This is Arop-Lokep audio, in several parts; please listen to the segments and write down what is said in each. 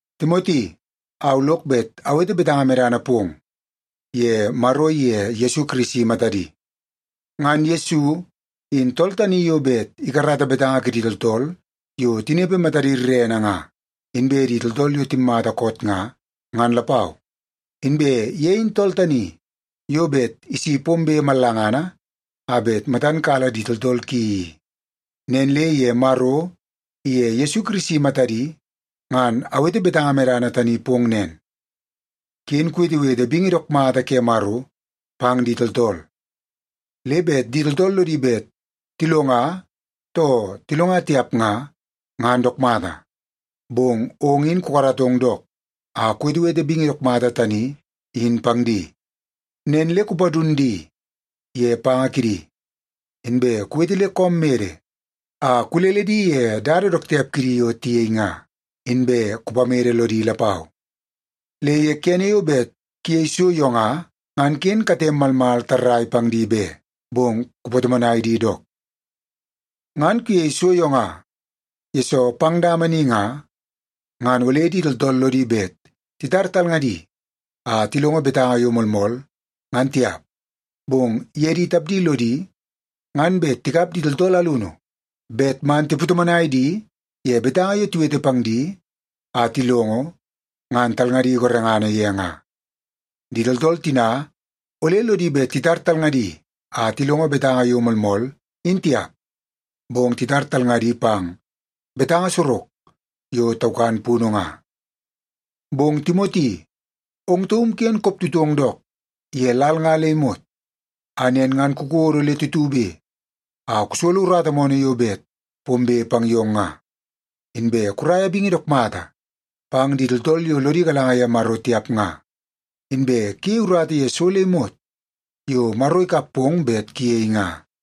Timoti, au lok bet awete betanga medana pong ye Maro iye Yesu Kirisi matadi. Ngan Yesu in tool tani yo bet ikarata betanga kidi tooltool yo tinepe matadi rerene nga, inbe di tooltool yo timmata koot nga, ngan lapau. Inbe ye in tool tani yo bet isi pombe mallangana a bet matan kala di tooltool ki i. Nen le ye Maro iye Yesu Kirisi matadi ngan awete betanga medana tani pong nen, ken kuwetewete bingi dook mata ke Maro pang di tooltool. Le bet di tooltool lodi bet tilonga too tilonga tiap nga, ngan dook mata, bong ong in kukaratong dook a kuwetewete bingi dook mata tani in pang di. Nen le kupadun di ye panga kidi, inbe kuwete le koom mede a kulele di ye dada dook tiap kidi yo tiyei nga, inbe kupamede lodi lapau. Le ye kene yo bet kuyei so yo nga, ngan ken katem malmal tarrai pang di be, bong kupatomonai di dook. Ngan kuyei so yo nga, yesoo pang dama ni nga, ngan ole di tooltool lodi bet titar talngadi a tilongo betanga yo moolmool, ngan tiap. Bong ye di tapdi lodi ngan bet tikap di tooltool alunu bet man tipatomonai di ye betanga yo tiwete pang di a tilongo, ngan talngadi gorengana ye nga. Di tooltool tina ole lodi bet titar talngadi a tilongo betanga yo moolmool in tiap, bong titar talngadi pang betanga sorok yo taukan punu nga. Bong Timoti, ong taum ken koptutong dook ye lal nga le imot a nen ngan kukodo le tutube a kusolo urata moonoo yo bet pombe pang yong nga, inbe kuraia bingi dook mata pang di tooltool yo lodi galanga ye Maro tiap nga, inbe kuyei urata ye so le imot yo Maro ikap pong bet kuyei nga.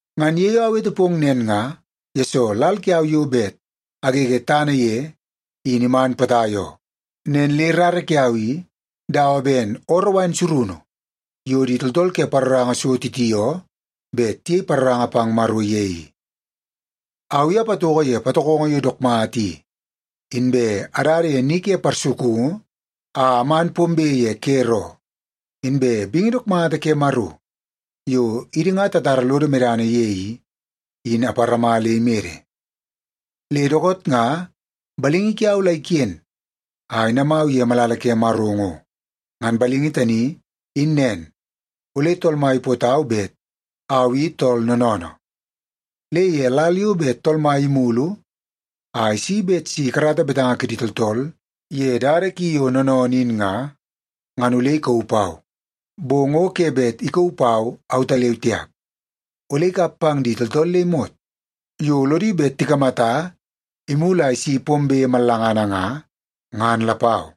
Ngan ye yo awete pong nen nga, yesoo lal kiau yo bet agege tana ye in iman potai oo. Nen le rara kiau i dawa ben ooroo wain surunu yo di tooltool ke paroranga so titioo bet tiyei paroranga pang Maro ye i. Au i apatoko ye patokongo yo dook mata i, inbe adada ye ni ke parsukungu a aman pombe ye ker oo, inbe bingi dook mata ke Maro yo idi nga tatara lodo medana ye i, in aparama le imede. Le dookoot nga balingi kiau la iken a inamau ye malala ke Maro ngo. Ngan balingi tani in nen ole Tool Mai ipootau bet au i tool noonoonoo. Le ye lal yo bet Tool Mai imulu a isi bet si ikarata betanga kidi tooltool ye dada ki yo noonoonoo in nga, ngan ole ikauu pau. Bong o ke bet ikauu pau autaleu tiap. Ole ikap pang di tooltool le imot yo lodi bet tikamata imulu a isi pombe mallangana nga, ngan lapau.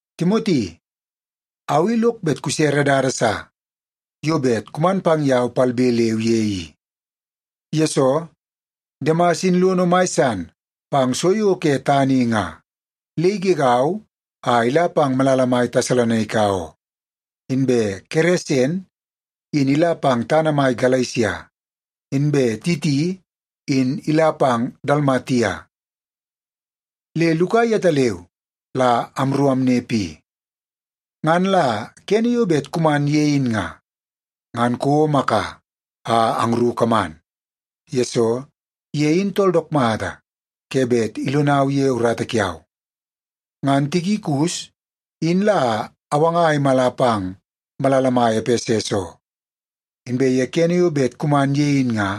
Timoti, au i lok bet kusere dada sa yo bet kuman pang yau palbe leu ye i. Yesoo, Demas in lono mai san pang so yo ke tana i nga le igegau a ila pang malala mai Tesalonaika oo. Inbe Keresen in ila pang tana mai Galesia, inbe Titi in ila pang Dalmatia. Le Luka yetaleu la amru amnepe i. Ngan la kene yo bet kuman ye in nga, ngan kouo Maka a angru kaman. Yesoo, ye in tool dook mata ke bet ilonau ye urata kiau. Ngan Tikikus in la awanga a imala pang malala mai Epeses oo. Inbe ye kene yo bet kuman ye in nga,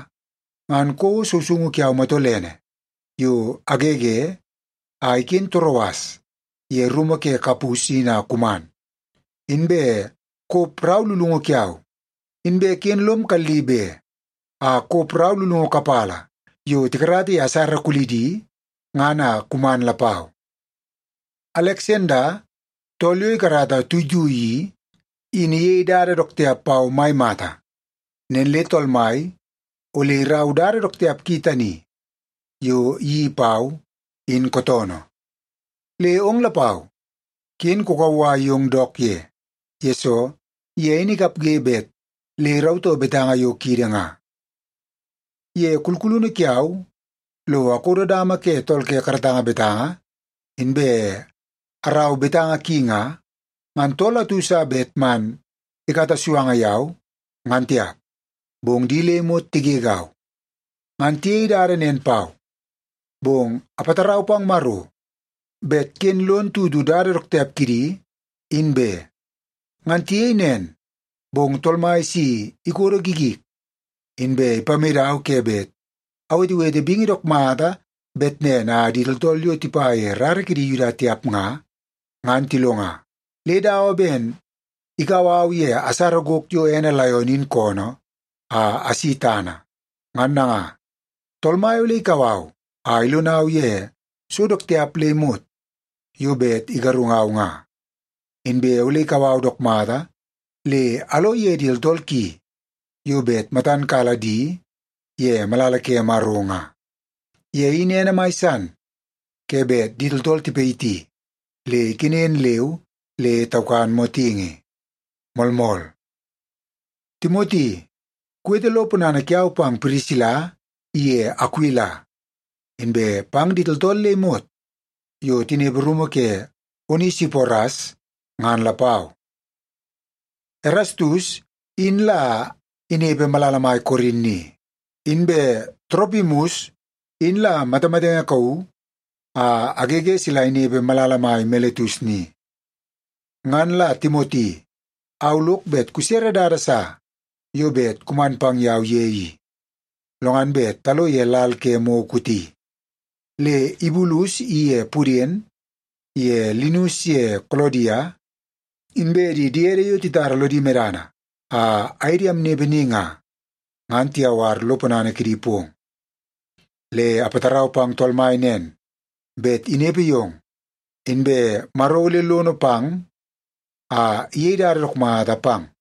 ngan kouo sousoungu kiau matolene yo agege a iken Toroas ye rumu ke Kapus in a kuman. Inbe kop rau lulungu kiau, inbe ken lom kalli be a kop rau lulungu kapala yo tikarata ye asara kulidi ngan a kuman lapau. Aleksanda tool yo ikarata tuitui i, in iyei dada dook tiap pau mai mata. Nen le Tool Mai ole iraua dada dook tiap ki tani yo iyeii pau, in kootoonoo. Le ong lapau, ken kukauwai yong dook ye. Yesoo, ye in ikapge bet le irautoo betanga yo kiidi nga. Ye kulkulunu kiau lo akodo dama ke tool ke karatanga betanga inbe arau betanga ki nga, ngan tool atu sa bet man ikata suanga yau, ngan tiap. Bong di le imot tigegau. Ngan tiyei dada nen pau, bong apatarau pang Maro bet ken lon tutu dada dook tiap kidi, in be. Ngan tiyei nen, bong Tool Mai si ikodo gigik, inbe ipamedau ke bet awetewete bingi dook mata bet nen a di tooltool yo tipa ye rara kidi Yuda tiap nga, ngan tilonga. Le dawa ben ikau au ye asara gok yo ene laion in koonoo a asi tana. Ngan nanga, Tool Mai ole ikau au a ilonau ye so dook tiap le imot yo bet igarungau nga. Inbe ole ikau au dook mata le alo ye di tooltool ki yo bet matan kala di ye malala ke Maro nga. Ye in ene mai san ke bet di tooltool tipayiti le ikenen leu le taukan motingi. Moolmool. Timoti, kuwete lo ponana kiau pang Pirisila iye Akuila inbe pang di tooltool le imot yo tinepe rumu ke Onesiporas ngan lapau. Erastus in la inepe malala mai Korin ni. Inbe Toropimus in la matamatenge kauu a agege sila inepe malala mai Miletus ni. Ngan la Timoti au lok bet kusere dada sa yo bet kuman pang yau ye i, lo ngan bet talo ye lal ke mou kooti. Le Ibulus iye Puden ye Linus ye Kolodia, inbe di diede yo titara lodi medana a aye di amnepe ni nga, ngan tiyawar lo ponana kidi pong. Le apatarau pang Tool Mai nen, bet inepe yong, inbe Maro ole lono pang a iyei dada dook mata pang.